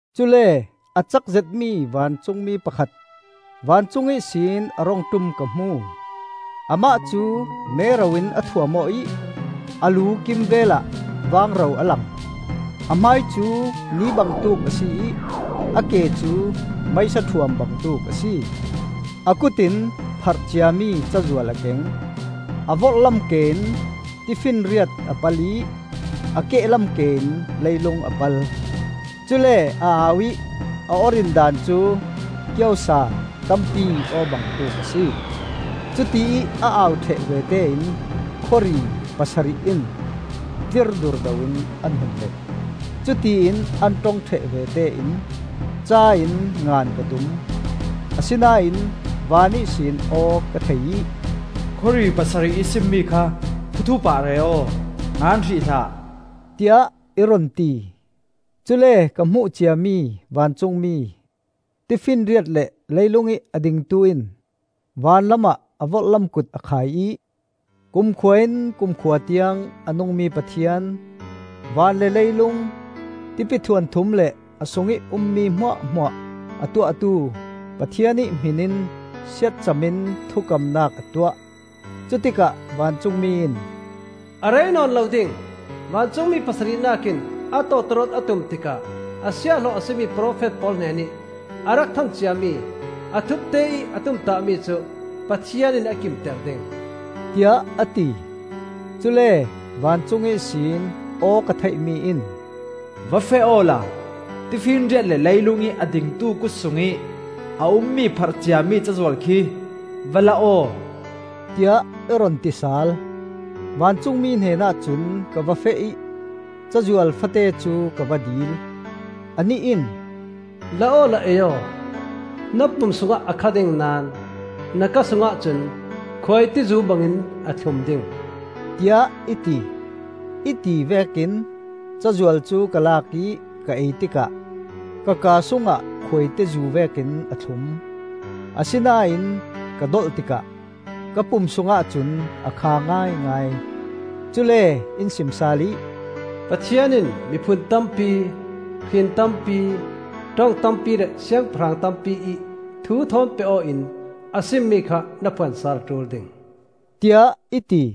Cule a cak zetmi vancungmi pakhat vancung ihsin a rung ṭum ka hmu. Amah cu mero in a thuam aw ih a lu kimvelah vangro a lang. A hmai cu ni bangtuk a si ih a ke cu meisa ṭhuam bangtuk a si. A kut in pharh ciami cazual a keng. A vorhlam ke in tifinriat a pal ih a kehlam ke in leilung a pal; cule a au ih a aw rindan cu kiosa tampi aw bangtuk a si. Cutiih a au ṭheh vete in khuari pasarih in tlir durdo in an hun let. Cutiin an ṭong ṭheh vete in ca in ngan ka tum. Asinain van ihsin aw ka thei ih, “Khawri pasarih ih simmi kha thuthup ah re aw; ngan hrih hlah,” tiah i run ti. Cule ka hmuh ciami vancungmi, tifinriat le leilungih a dingtu in van lamah a vorhlam kut a khai ih, kumkhua-in kumkhua tiang a nungmi Pathian, van le leilung, tipi thuanthum le a sungih ummi hmuahhmuah a tuahtu Pathian ih hmin in siatcam in thukamnak a tuah. Cutikah vancungmi in, “A rei nawn lo ding. Vancungmi pasarihnak in a tawtawrawt a tum tikah a siahhlawh a si mi profet pawl hnenih a rak than ciami a thupte ih a tumtahmi cu Pathian in a kimter ding,” tiah a ti. Cule vancung ihsin aw ka theihmi in, “Va feh awla tifinriat le leilungih a dingtu kut sungih a ummi pharh ciami cazual khi va la aw,” tiah i run ti sal. Vancungmi hnenah cun ka va feh ih cazual fate cu ka va dil. Anih in, “La awla ei aw; na pum sungah a kha ding naón na kaa sungah cun khuaitizu bangin a thlum ding,” tiah i ti. I ti vekin cazual cu ka lak ih ka ei tikah ka kaa sungah khuaitizu vekin a thlum; asinain ka dolh tikah ka pum sungah cun a kha ngaingai. Cule in sim sal ih, “Pathian in miphun tampi, hrin tampi, ṭong tampi le siangpahrang tampiih thu thawn peh aw in a simmi kha na phuan sal a ṭul ding,” tiah i ti.